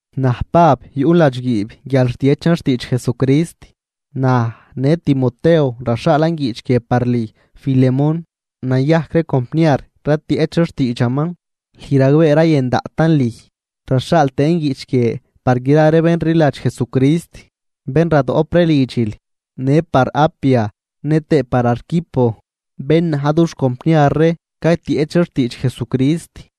Naj Pab, yuꞌn ladxguiib guial rtiechan xtiidx Jesucrist. Naj, në Timoteo raxhaalan guiꞌch guie par lüj Filemón, nayajc ree compniar ratieꞌch ree xtiidxaman, lüj ragbee rayën daꞌtan lüj. Raxhaal tëën guiꞌch guie par gra ree bén rliladx Jesucrist bén radoꞌp ree lidxil, në par Apia nëtëë par Arquipo, bén na̱j dux compniar ree caytieꞌch ree xtiidx Jesucrist.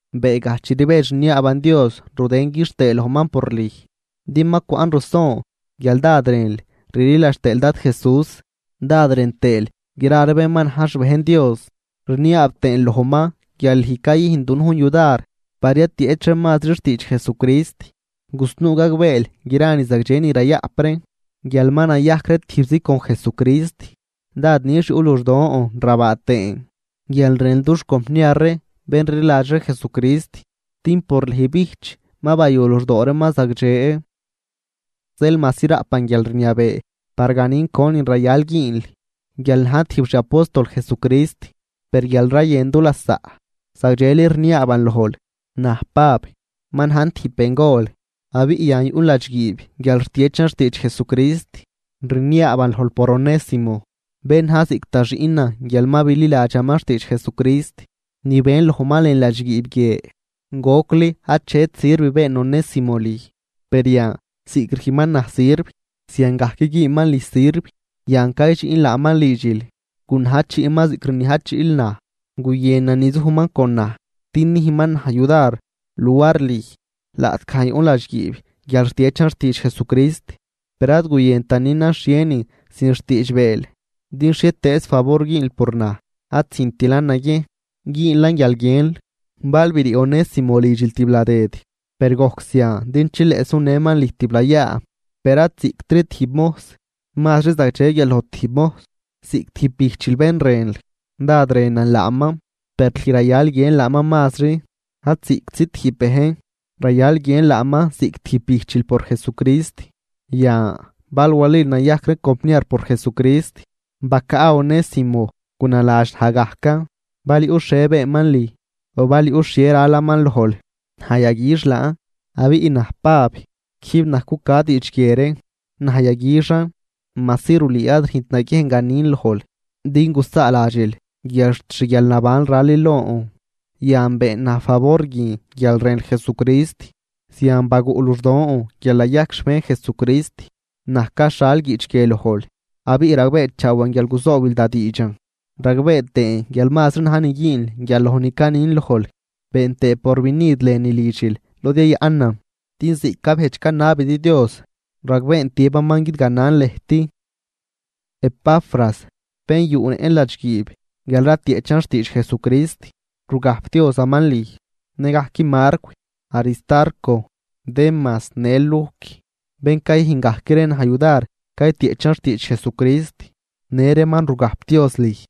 Beegaj chi rbedx rniaaban Dios rudën quixtëë lojman por lüj, din ma cwaꞌn ruson guial dád rënl rliladx tëël Dad Jesús dád rën tëël gra ree bén ma na̱j xbejn Dios. Rniaab tëën lojman guial lüj cayüjnl dunujn yudar par yatieꞌch ree mazri xtiidx Jesucrist, gusnuu gagbeel gra ni zagdxe ni rayaꞌp ree guial ma nayajc ree tijbzi con Jesucrist. Dád nix yuꞌ luxdon rabaa tëën guial rënl dux compniar ree bén rliladx ree Jesucrist, din por lüj bijch ma bayu luxdoo reeman zagdxe. Zeel majsi raꞌpan guialrniabee par ganin conin rayal güünl guial najn tijb xi apóstol Jesucrist, per guial rayën du lasaꞌ, zagdxeli rniaaban lojl, naj Pab, ma najn tijb bengol abiꞌ yan yuꞌn ladxguiib guial rtiechan xtiidx Jesucrist, rniaaban lojl por Onésimo, bén na̱j ziꞌc da xiꞌnan guial ma bililadxaman xtiidx Jesucrist ni ben lojman lën ladxguiib guie. Gocli achet sirv been Onésimo lüj, per yan ziꞌc rüjnman naj sirv ziangajc güünman lüj sirv. Yan caydxiꞌn laaman lidxil, gunajchiꞌman ziꞌc rniajchiꞌl naj. Guyënan nizujman con naj din nüjnman naj yudar luar lüj, laꞌtgaj yuꞌn ladxguiib guial rtiechan xtiidx Jesucrist. Per ad guyëntan nünan xhienin sin xtiidxbeel din xhietëëz favor güünl por naj ad züjntilan naguiejn, güünlan guial guiënl. Bal brii Onésimo lidxil tibladëd, per gojc zian din chileꞌ sunëman lüj tiblayaa, per ad ziꞌctri tijb mojs, mazri zagdxe guial loj tijb mojs, ziꞌc tijb bijchil bén rënl. Dád rënan laaman, per lüj rayal guiënl laaman mazri ad ziꞌctzi tijb bejn, rayal guiënl laaman ziꞌc tijb bijchil por Jesucrist. Yan bal walil nayajc ree compniar por Jesucrist, bacaꞌ Onésimo gunaladx naj gajcan. Bal yuꞌ xhie beenman lüj, o bal yuꞌ xhie ralaman lojl, naj yaguix laan. Abiꞌ naj Pab, quijb naj cuca diidx guie ree: Naj yaguixan, majsi rulüü ad rüjnt naguiejn ganin lojl din gusaaladxil guial xt xguialnabanl ralil lon. Yan been naj favor guin guial rënl Jesucrist, zian baguꞌ luxdon guial nayajc xbejn Jesucrist. Naj caxhal guiꞌch guie lojl abiꞌ ragbeechaawan guial guzoobil da diidxan, ragbee tëën guial mazri na̱j ni güünl guial loj ni canin lojl. Been tëë porvinid lënü lidxil lod yayaꞌnan, din ziꞌc cabejdx canabidi Dios, ragbeen tiëbaman guidganan lëjt. Epafras, bén yuꞌnëꞌn ladxguiib guial ratieꞌchan xtiidx Jesucrist, rugajpdiozaman lüj. Nëgajc Marcw, Aristarco, Demas në Lujc, bén cayüjn gajc ree naj yudar caytieꞌchan xtiidx Jesucrist në reeman rugajpdioz lüj.